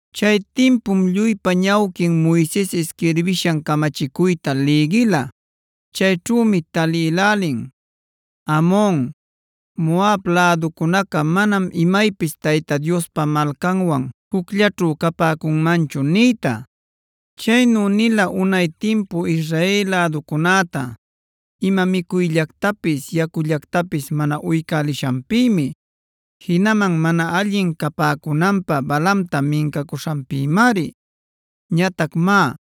Chay timpum lluypa ñawquin Moises isquirbishan camachicuyta lïgila. Chayćhümi talïlälin: “Amon, Moab läducunaca manam imaypis Tayta Diospa malcanwan jucllaćhu capäcunmanchu” nïta. Chaynu nila unay timpu Israel läducunäta ima micuyllactapis yacullactapis mana uycälishanpïmi. Jinaman mana allin capäcunanpä Balaamta mincacuśhanpïmari.a Ñatac má,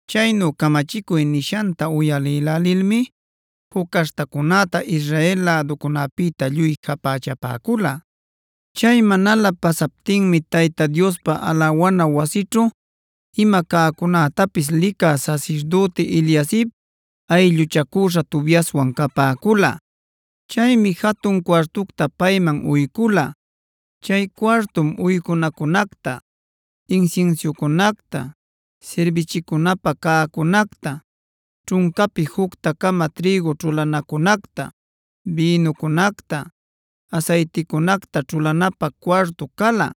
Chaynu camachicuy nishanta uyalïlälilmi juc caśhtacunäta Israel läducunäpïta lluy japächapäcula. Chay manalä pasaptinmi Tayta Diospa alawana wasićhu ima cäcunätapis licä sasirdüti Eliasib aylluchacüśha Tobiaswan capäcula. Chaymi jatun cuartucta payman uycula.c Chay cuartum uycunacunacta, insinsiucunacta, sirbichicunapä cäcunacta, ćhuncapi jucta-cama trïgu ćhulanacunacta, bïnucunacta, asayticunacta ćhulanapä cuartu cala.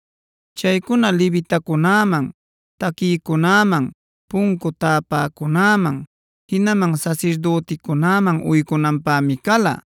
Chaycuna levitacunäman, taquïcunäman, puncu täpäcunäman, jinaman sasirdüticunäman uycunanpämi cala.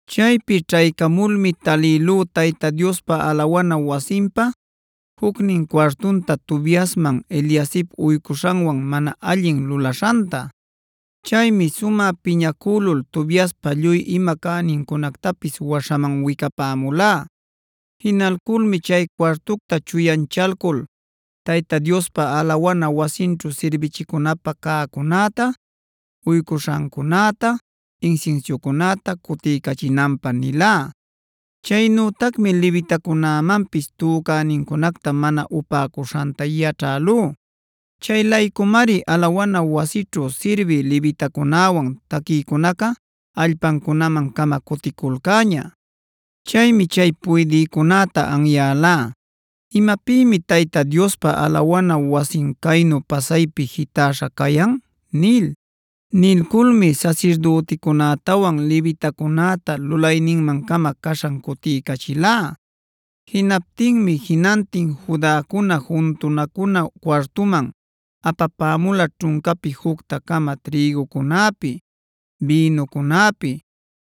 Chaypi ćhaycamulmi talïlú Tayta Diospa alawana wasinpa jucnin cuartunta Tobiasman Eliasib uycuśhanwan mana allin lulaśhanta. Chaymi sumä piñacülul Tobiaspa lluy ima cänincunactapis waśhaman wicapämulá. Jinalculmi chay cuartucta chuyanchalcul Tayta Diospa alawana wasinćhu sirbichicunapä cäcunäta, uycuśhancunäta, insinsiucunäta cutiycachinanpä nilá. Chaynütacmi levitacunämanpis tücänincunacta mana upäcuśhanta yaćhälú.d Chay laycumari alawana wasićhu sirbï levitacunäwan taquïcunaca allpancunaman-cama cuticulcäña. Chaymi chay puydïcunäta anyälá: “¿Imapïmi Tayta Diospa alawana wasin caynu pasaypi jitäśha cayan?” nil. Nilculmi sasirdüticunätawan levitacunäta lulayninman-cama caśhan cutiycachilá. Jinaptinmi jinantin Judacuna juntunacuna cuartuman apapämula ćhuncapi jucta-cama trïgucunäpi, bïnucunäpi,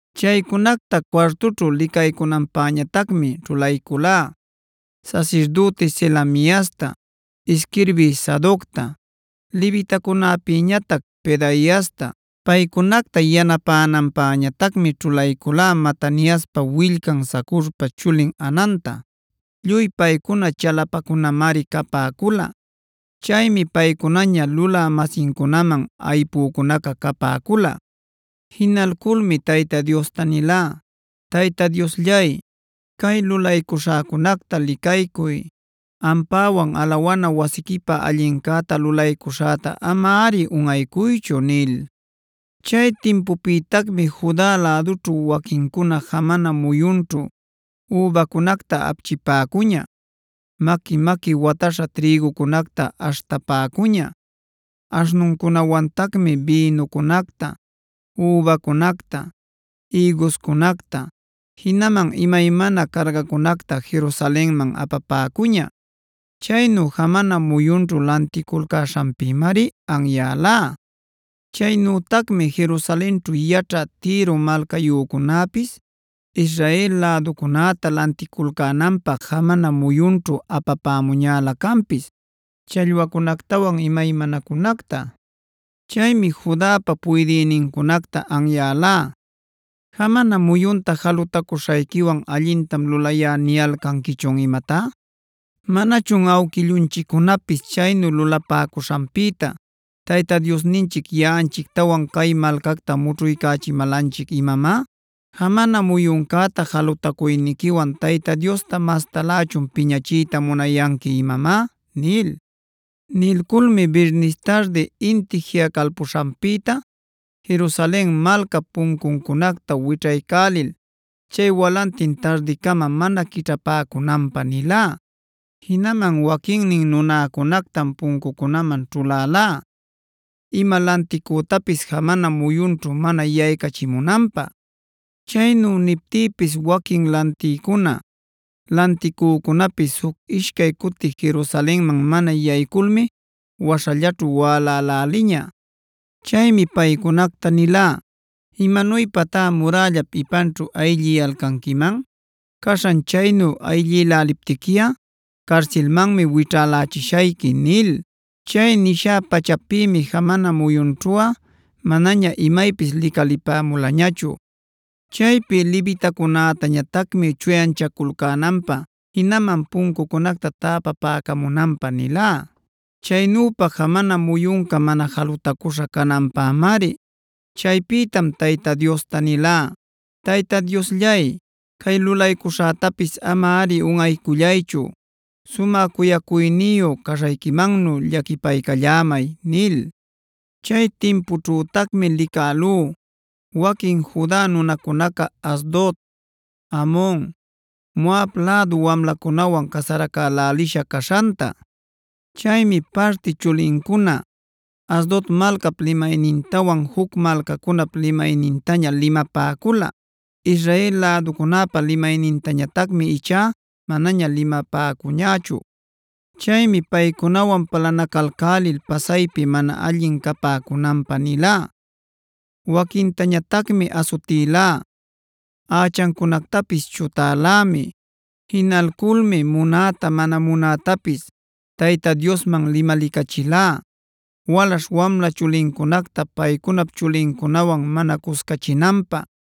Chaycunacta cuartućhu licaycunanpäñatacmi ćhulayculá: sasirdüti Selemiasta, isquirbï Sadocta, levitacunäpïñatac Pedaiasta. Paycunacta yanapänanpäñatacmi ćhulayculá Mataniaspa willcan Zacurpa chulin Hananta. Lluy paycuna chalapacunamari capäcula. Chaymi paycunaña lulä-masincunaman aypücunaca capäcula. Jinalculmi Tayta Diosta nilá: “Tayta Diosllay, cay lulaycuśhäcunacta licaycuy; ampäwan alawana wasiquipä allincäta lulaycuśhäta amari unꞌaycuychu” nil. Chay timputacmi Juda lädućhu waquincuna jamana muyunćhu übacunacta apchipäcuña, maqui-maqui watäśha trïgucunacta aśhtapäcuña; aśhnuncunawantacmi bïnucunacta, übacunacta, ïguscunacta, jinaman imaymana cargacunacta Jerusalenmanf apapäcuña. Chaynu jamana muyunćhu lanticulcäśhanpïmari anyälá. Chaynütacmi Jerusalenćhu yaćhä Tiro malcayücunäpis Israel läducunäta lanticulcänanpä jamana muyunćhu apapämuñälä canpis challwacunactawan imaymanacunacta. Chaymi Judapa puydïnincunacta anyälá: “¿¡Jamana muyunta jalutacuśhayquiwan ‘allintam lulayá’ niyalcanquichun imatá!? ¿Manachun awquillunchiccunapis chaynu lulapäcuśhanpïta Tayta Diosninchic yaꞌanchictawan cay malcacta mućhuycachimälanchic imamá? ¿Jamana muyuncäta jalutacuyniquiwan Tayta Diosta mastalächun piñachiyta munayanqui imamá?” nil. Nilculmi birnis tardi inti jiꞌacalpuśhanpïta Jerusalen malcap puncuncunacta wićhaycälil chay walantin tardicama mana quićhapäcunanpä nilá. Jinaman waquinnin nunäcunactam puncucunaman ćhulalá ima lanticütapis jamana muyunćhu mana yaycachimunanpä. Chaynu niptïpis waquin lantïcuna, lanticücunapis juc ishcay cuti Jerusalenman mana yayculmi waśhallaćhu wäläläliña. Chaymi paycunacta nilá: “¿Imanuypatá murällap ipanćhu aylliyalcanquiman? Caśhan chaynu aylliyalcaptiquiꞌa carsilmanmi wićhälächishayqui” nil. Chay nishä-pachapïmi jamana muyunćhuꞌa manaña imaypis licalipämulañachu. Chaypi levitacunätañatacmi chuyanchaculcänanpä jinaman puncucunacta täpapäcamunanpä nilá. Chaynüpa jamana muyunca mana jalutacüśha cananpämari. Chaypïtam Tayta Diosta nilá: “Tayta Diosllay, cay lulaycuśhätapis amari unꞌaycullaychu; sumä cuyacuyniyu caśhayquimannu llaquipaycallämay” nil. Chay timpućhütacmi licälú waquin Juda nunacunaca Asdod, Amon, Moab lädu wamlacunawan casaracälälisha caśhanta. Chaymi parti chulincuna Asdod malcap limaynintawan juc malcacunap limaynintaña limapäcula. Israel läducunäpa limaynintañatacmi ichá manaña limapäcuñächu. Chaymi paycunawan palanacalcälil pasaypi mana allin capäcunanpä nilá, waquintañatacmi asutilá, ächancunactapis chutälämi. Jinalculmi munäta mana munätapis Tayta Diosman limalicachilá, walaśh-wamla chulincunacta paycunap chulincunawan mana cuscachinanpä,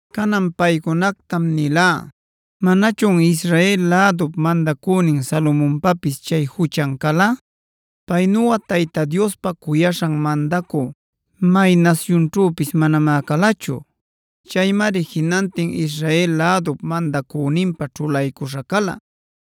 Canan paycunactam nilá: “¿Manachun Israel lädup mandacünin Salomonpapis chay juchan cala? Paynuꞌa Tayta Diospa cuyaśhan mandacü may nasyunćhüpis manamá calachu.h Chaymari jinantin Israel lädup mandacüninpä ćhulaycuśha cala.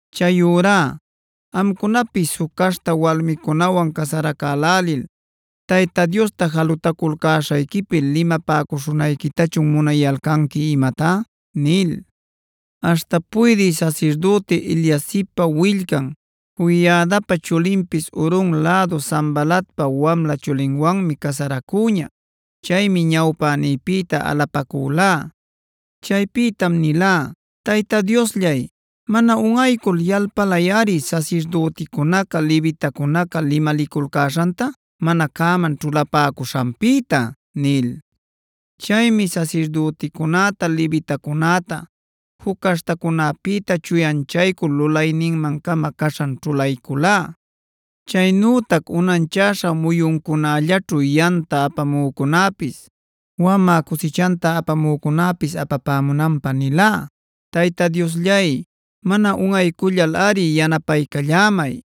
Chayurá ¿¡amcunapis juc caśhta walmicunawan casaracälälil Tayta Diosta jalutaculcäśhayquipi limapäcuśhunayquitachun munayalcanqui imatá!?” nil. Aśhta puydï sasirdüti Eliasibpa willcan, Joiadapa chulinpis Horon lädu Sanbalatpaj wamla chulinwanmi casaracüña. Chaymi ñawpänïpïta alapacülá. Chaypïtam nilá: “Tayta Diosllay, mana unꞌaycul yalpalayꞌari sasirdüticunaca levitacunaca limaliculcäśhanta mana cäman ćhulapäcuśhanpïta” nil. Chaymi sasirdüticunäta levitacunäta juc caśhtacunäpïta chuyanchaycul lulayninman-cama caśhan ćhulayculá. Chaynütac unanchäśha muyuncunällaćhu yamta apamücunäpis, wamä cusichanta apamücunäpis apapämunanpä nilá. ¡Tayta Diosllay, mana unꞌaycullalꞌari yanapaycallämay!